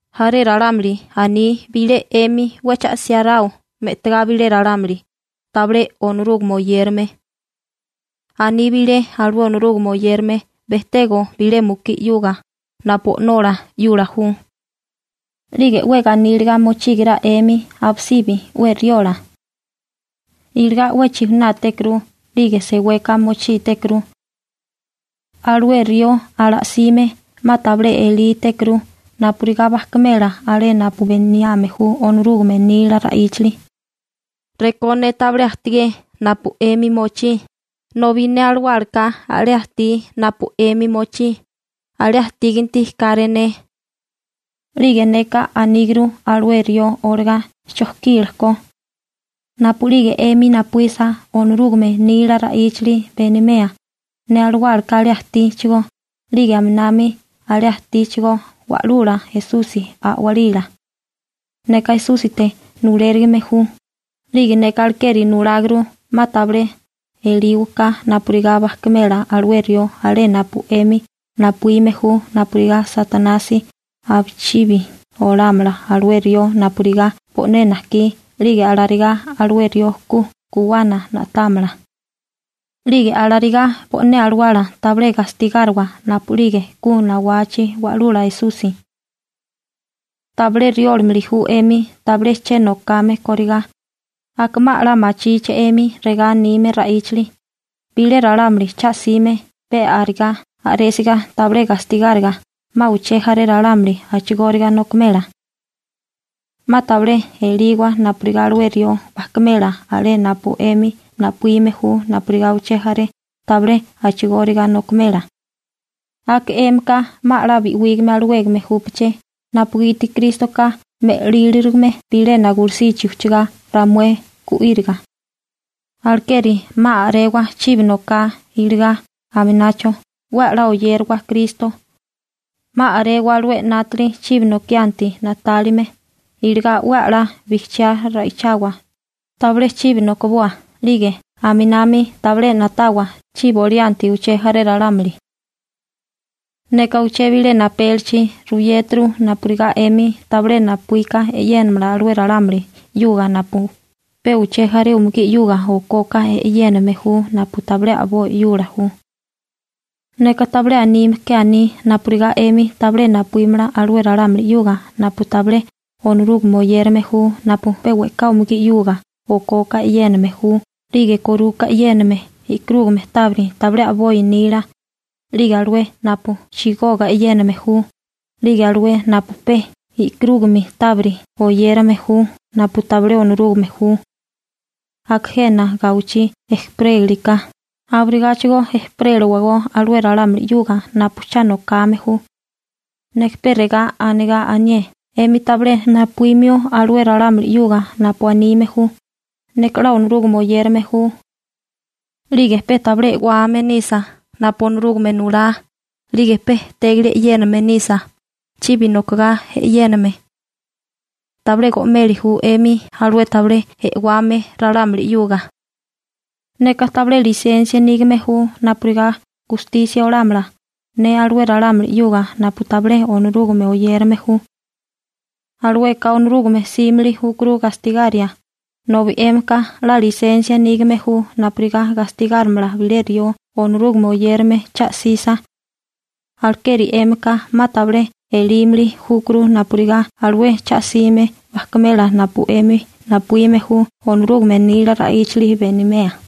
Jaré ralámuli aní bilé 'emi 'we cha 'siáráo me'tigá bilé ralámuli tabilé Onorúgame oyérame. Aní bilé alué Onorúgame oyérame bejtego bilé mukí 'yuga napu o'nola 'yula ju. 'Lige 'we ganíliga mochígara 'emi abisibi 'we riola. Iligá 'we chijunátékuru 'lige seweka mochítékuru. Alué rió ala'sime 'ma tabilé elítékuru napurigá bajkimela alé napu beniame ju Onorúgame nila ra'íchali. Rekó ne tabilé ajtigé napu 'emi mochí, nobi ne alawálaka alé ajtí napu 'emi mochí, 'la alé ajtíganti káré ne. 'Lige neka aníguru alué rió olagá chojkila ko. Napu'lige 'emi napuísa Onorúgame nila ra'íchali benimea, ne alawálaka alé ajtíchigó 'lige aminami alé ajtíchigó Wa'lula Esusi A'walila. Neka Esúsite nulérigime ju, 'lige neka alekeri nuláguru 'ma tabilé elíwaká napurigá bajkimela alué rió alé napu 'emi napuíme ju napurigá Satanasi abichibi olámala alué rió napurigá bo'né najkí 'lige alarigá alué rió ku guwana na'támala. 'Lige alarigá bo'né alawala tabilé gastigáriwa napu'lige ku nawachi Wa'lula Esusi. Tabilé riólimili ju 'emi tabilé che nokame kórigá, aka 'ma 'la machíché 'emi regá anime ra'íchali: «Bilé ralámuli cha 'sime pe arigá a'résiga tabilé gastigáriga, 'ma uché jaré ralámuli a'chigóriga nokimela.» 'Ma tabilé eliwa napurigá alué rió bajkimela alé napu 'emi napuíme ju, napurigá uché jaré tabilé a'chigóriga nokimela. Aka 'émika 'ma 'la bi'wígame alawégame júpaché napugiti Krístoka me'líriligame bilena gulusichi ujchagá ramué gu'íriga. Alekeri 'ma a'rewa chibi noká iligá aminacho 'we 'la oyérawa Kristo, 'ma a'rewa alué 'nátali chibi nokianti na'tálime. Iligá 'we 'la bijchiá ra'ichawa, tabilé chibi nokiboa 'lige aminami tabilé na'tawa chibi olianti uché jaré ralámuli. Neka uché bilena apélichi ruyéturu napurigá 'emi tabilé napuíka e'yénamala alué ralámuli 'yuga napu pe uché jaré umugí 'yuga okoka e'yéname ju napu tabilé a'boi 'yula ju. Neka tabilé anime ke aní napurigá 'emi tabilé napuímala alué ralámuli 'yuga napu tabilé Onorúgame oyérame ju napu pe we'ká umugí 'yuga okoka e'yéname ju 'lige koruka e'yéname e'karúgame tábiri tabilé a'boi nila, 'lige alué napu chigoga e'yéname ju, 'lige alué napu pe e'karúgame tábiri oyérame ju napu tabilé Onorúgame ju. Aka jena gawichí ejperéliriká abirigáchigo ejperélawagó alué ralámuli 'yuga napu cha nokame ju. Neka pe regá anigá anié 'emi tabilé napuímio alué ralámuli 'yuga napu anime ju: «Neka 'la Onorúgame oyérame ju.» 'Lige pe tabilé e'wame nisa napu Onorúgame nulá 'lige pe e'tégili e'yéname nisa, chibi nokigá e'yéname. Tabilé go'meli ju 'emi alué tabilé e'wame ralámuli 'yuga. Neka tabilé lisensia nígame ju napurigá gustisia olámala alué ralámuli 'yuga napu tabilé Onorúgame oyérame ju. Alueka Onorúgame 'símili júkuru gastigaria, nobi 'émika 'la lisensia nígame ju napurigá gastigárimala bilé rió Onorúgame oyérame cha 'sisa. Alekeri 'émika 'ma tabilé elímili júkuru napurigá alué cha'sime bajkimela napu 'emi napuíme ju Onorúgame nila ra'íchali benimea.